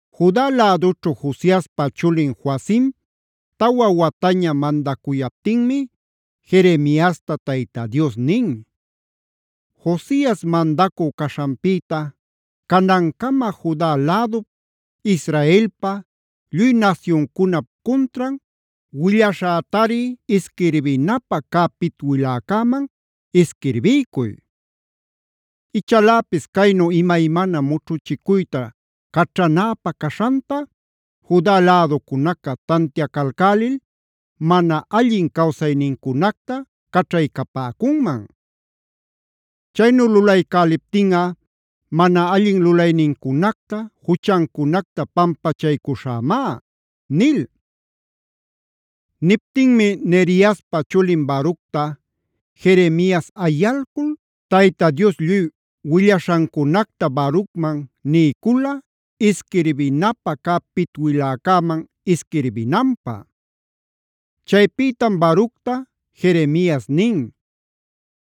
Juda lädućhu Josiaspa chulin Joacima tawa wataña mandacuyaptinmi Jeremiasta Tayta Dios nin: “Josias mandacü caśhanpïta canancama Juda lädup, Israelpa, lluy nasyuncunap cuntran willaśhätari isquirbinapä cä pitwiläcäman isquirbiycuy. Ichaläpis caynu imaymana mućhuchicuyta caćhanäpä caśhanta, Juda läducunaca tantiacalcälil mana allin cawsaynincunacta caćhaycapäcunman. Chaynu lulaycäliptinꞌa mana allin lulaynincunacta, juchancunacta pampachaycuśhämá” nil. Niptinmi Neriaspa chulin Baructa Jeremias ayalcul Tayta Dios lluy willaśhancunacta Barucman niycula, isquirbinapä cä pitwiläcäman isquirbinanpä. Chaypïtam Baructa Jeremias nin: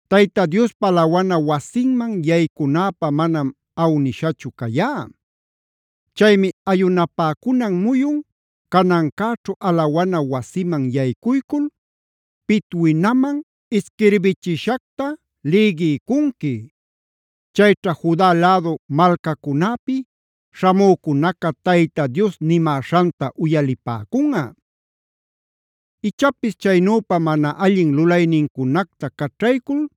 “Tayta Diospa alawana wasinman yaycunäpä manam awnishachu cayá. Chaymi ayunapäcunan muyun canancäćhu alawana wasiman yaycuycul pitwinamanb ishquirbichishacta lïgiycunqui. Chayćha Juda lädu malcacunäpi śhamücunaca Tayta Dios nimäśhanta uyalipäcunꞌa. Ichapis chaynüpa mana allin lulaynincunacta caćhaycul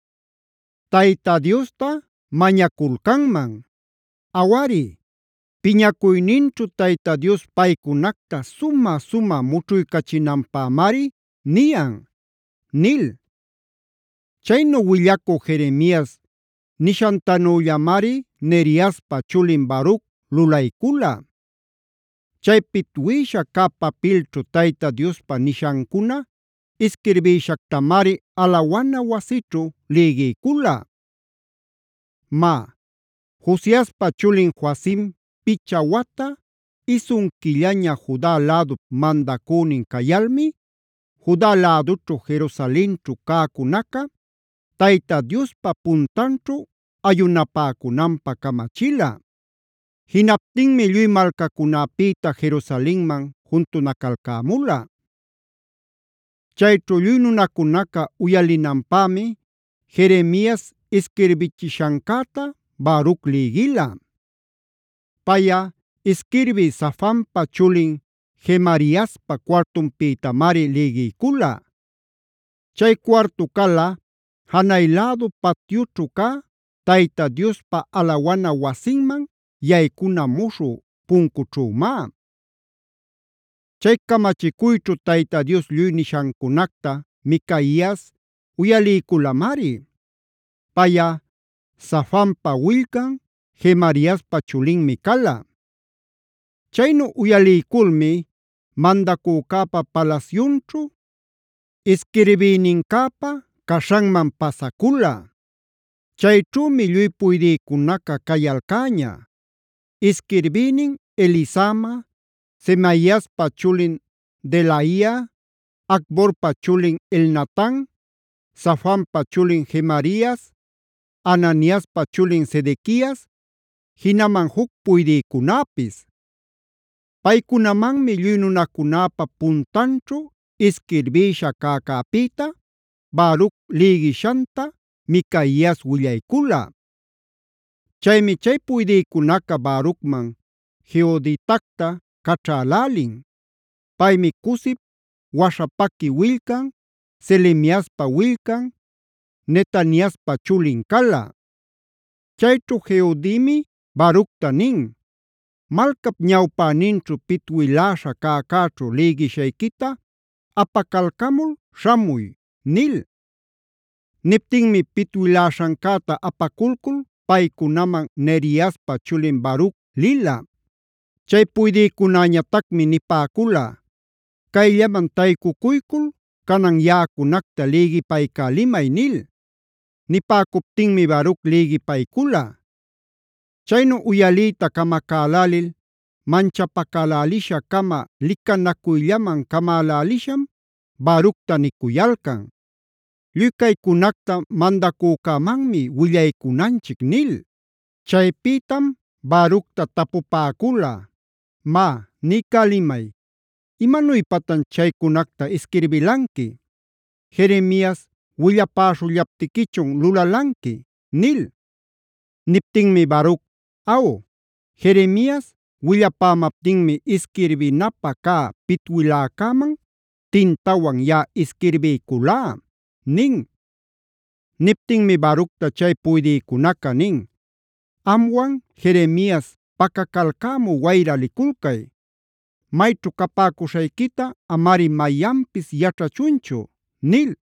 Tayta Diosta mañaculcanman. Awari, piñacuyninćhu Tayta Dios paycunacta sumä-sumä mućhuycachinanpämari niyan” nil. Chaynu willacü Jeremias nishantanüllamari Neriaspa chulin Baruc lulaycula. Chay pitwïsha cä papilćhu Tayta Diospa nishancuna isquirbïshactamari alawana wasićhu lïgiycula. Má, Josiaspa chulin Joacim picha wata, isun quillaña Juda lädup mandacünin cayalmi, Juda lädućhu Jerusalenćhu cäcunaca Tayta Diospa puntanćhu ayunapäcunanpä camachila. Jinaptinmi lluy malcacunäpïta Jerusalenman juntunacalcämula. Chayćhu lluy nunacunaca uyalinanpämi Jeremias isquirbichishancäta Baruc lïgila. Payꞌa isquirbï Safanpac chulin Gemariaspa cuartunpïtamari lïgiycula. Chay cuartu cala janay lädu patyućhu cä Tayta Diospa alawana wasinman yaycuna muśhü puncućhümá. Chay camachicuyćhu Tayta Dios lluy nishancunacta Micaias uyaliyculamari. Payꞌa Safanpa willcan, Gemariaspa chulinmi cala. Chaynu uyaliyculmi mandacücäpa palasyunćhu isquirbïnincäpa caśhanman pasacula. Chayćhümi lluy puydïcunaca cayalcäña: Isquirbïnin Elisama, Semaiaspa chulin Delaia, Acborpa chulin Elnatan, Safanpa chulin Gemarias, Ananiaspa chulin Sedequias, jinaman juc puydïcunäpis. Paycunamanmi lluy nunacunäpa puntanćhu isquirbïsha cäcäpïta Baruc lïgishanta Micaias willaycula. Chaymi chay puydïcunaca Barucman Jehuditacta caćhälälin. Paymi Cusip waśhapaqui willcan, Selemiaspa willcan, Netaniaspa chulin cala. Chayćhu Jehudimi Baructa nin: “Malcap ñawpäninćhu pitwiläśha cäcäćhu lïgishayquita apacalcamul śhamuy” nil. Niptinmi pitwiläśhancäta apaculcul paycunaman Neriaspa chulin Baruc lila. Chay puydïcunäñatacmi nipäcula: “Cayllaman taycucuycul canan yaꞌacunacta lïgipaycälimay” nil. Nipäcuptinmi Baruc lïgipaycula. Chaynu uyaliyta camacälälil manchapacälälisha-cama licanacuyllaman camälälisham Baructa nicuyalcan: “Lluy caycunacta mandacücämanmi willaycunanchic” nil. Chaypïtam Baructa tapupäcula: “Má niycälimay, ¿imanuypatan chaycunacta isquirbilanqui? ¿Jeremias willapäśhullaptiquichun lulalanqui?” nil. Niptinmi Baruc: “Aw, Jeremias willapämaptinmi isquirbinapä cä pitwiläcäman tintawan yaꞌa isquirbiyculá” nin. Niptinmi Baructa chay puydïcunaca nin: “Amwan Jeremias pacacalcämü wayra liculcay. Mayćhu capäcuśhayquita amari mayanpis yaćhachunchu” nil.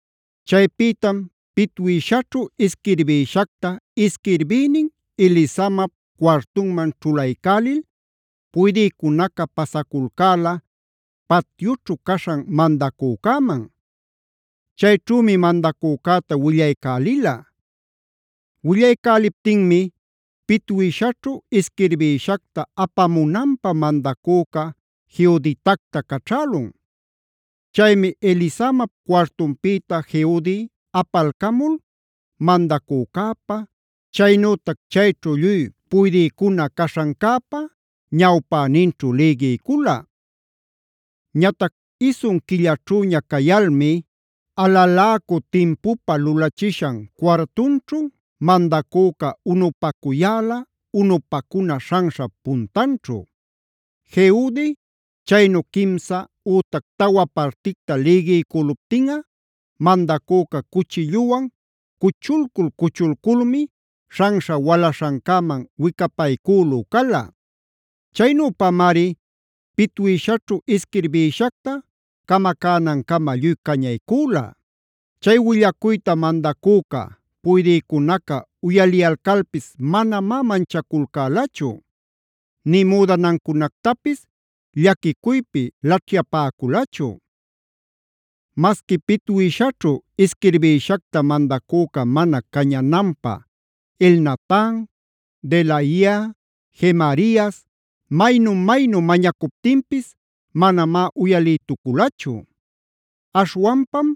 Chaypïtam pitwïshaćhu isquirbïshacta isquirbïnin Elisamap cuartunman ćhulaycälil, puydïcunaca pasaculcäla patyućhu caśhan mandacücäman. Chayćhümi mandacücäta willaycälila. Willaycäliptinmi pitwïshaćhu isquirbïshacta apamunanpä mandacüca Jehuditacta caćhälun. Chaymi Elisamap cuartunpïta Jehudi apalcamul mandacücäpa, chaynütac chayćhu lluy puydïcuna caśhancäpa ñawpäninćhu lïgiycula. Ñatac isun quillaćhüña cayalmi alaläcü timpupä lulachishan cuartunćhu mandacüca unupacuyäla unupacuna śhanśhap puntanćhu. Jehudi chaynu quimsa ütac tawa particta lïgiycüluptinꞌa mandacüca cuchilluwan cuchulcul-cuchulculmi śhanśha walaśhancäman wicapaycülü cala. Chaynüpamari pitwïshaćhu isquirbïshacta camacänancama lluy cañaycüla. Chay willacuyta mandacüca, puydïcunaca uyaliyalcalpis manamá manchaculcälachu; nï müdanancunactapis llaquicuypi laćhyapäculachu. Masqui pitwïshaćhu isquirbïshacta mandacüca mana cañananpä Elnatan, Delaia, Gemarias maynu-maynu mañacuptinpis manamá uyalïtuculachu. Aśhwanpam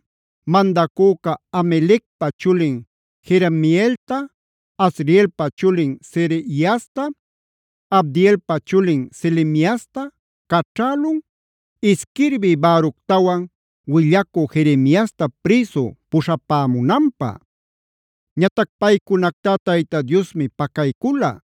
mandacüca Hamelecpa chulin Jerameelta, Azrielpa chulin Sereiasta, Abdeelpa chulin Selemiasta caćhälun, isquirbí Baructawan willacü Jeremiasta prïsu puśhapämunanpä. Ñatac paycunactá Tayta Diosmi pacaycula.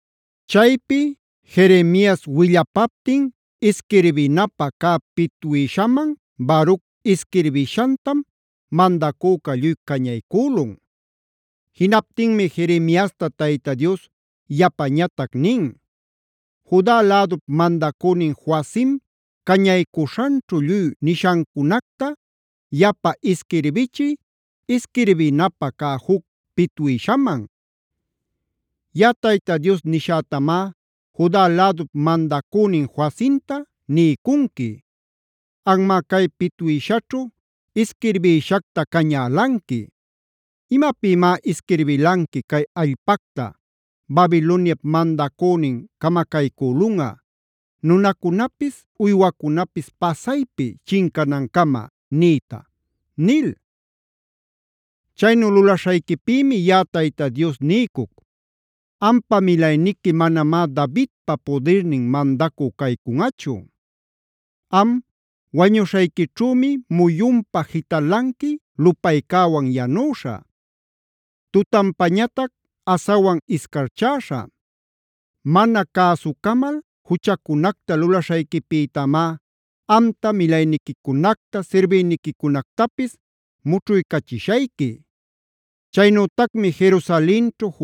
Chaypi Jeremias willapaptin isquirbinapä cä pitwïshaman Baruc isquirbishantam mandacüca lluy cañaycülun. Jinaptinmi Jeremiasta Tayta Dios yapañatac nin: “Juda lädup mandacünin Joacim cañaycuśhanćhu lluy nishancunacta yapa isquirbichiy isquirbinapä cä juc pitwïshaman. Yaꞌa Tayta Dios nishätamá Juda lädup mandacünin Joacimta niycunqui: Anmá cay pitwïshaćhu isquirbïshacta cañälanqui: ‘¿Imapïmá isquirbilanqui cay allpacta Babiloniap mandacünin camacaycülunꞌa, nunacunapis uywacunapis pasaypi chincanancama niyta?’ nil. Chaynu lulaśhayquipïmi yaꞌa Tayta Dios niycuc: Ampa milayniqui manamá Davidpa pudirnin mandacü caycunꞌachu. Am wañuśhayquićhümi muyunpa jitalanqui lupaycäwan yanüśha, tutanpa asawan iscarchäśha. Mana cäsucamal juchacunacta lulaśhayquipïtamá amta, milayniquicunacta, sirbïniquicunactapis mućhuycachishayqui. Chaynütacmi Jerusalenćhu,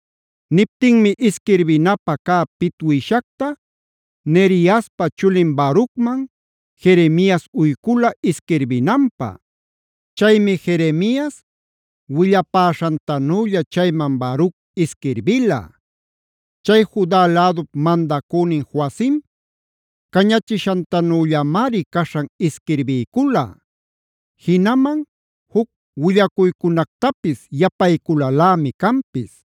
Niptinmi isquirbinapä cä pitwïshacta Neriaspa chulin Barucman, Jeremias uycula isquirbinanpä. Chaymi Jeremias willapäśhantanülla chayman Baruc isquirbila. Chay Juda lädup mandacünin Joacim cañachishantanüllamari caśhan isquirbiycula. Jinaman juc willacuycunactapis yapayculalämi canpis.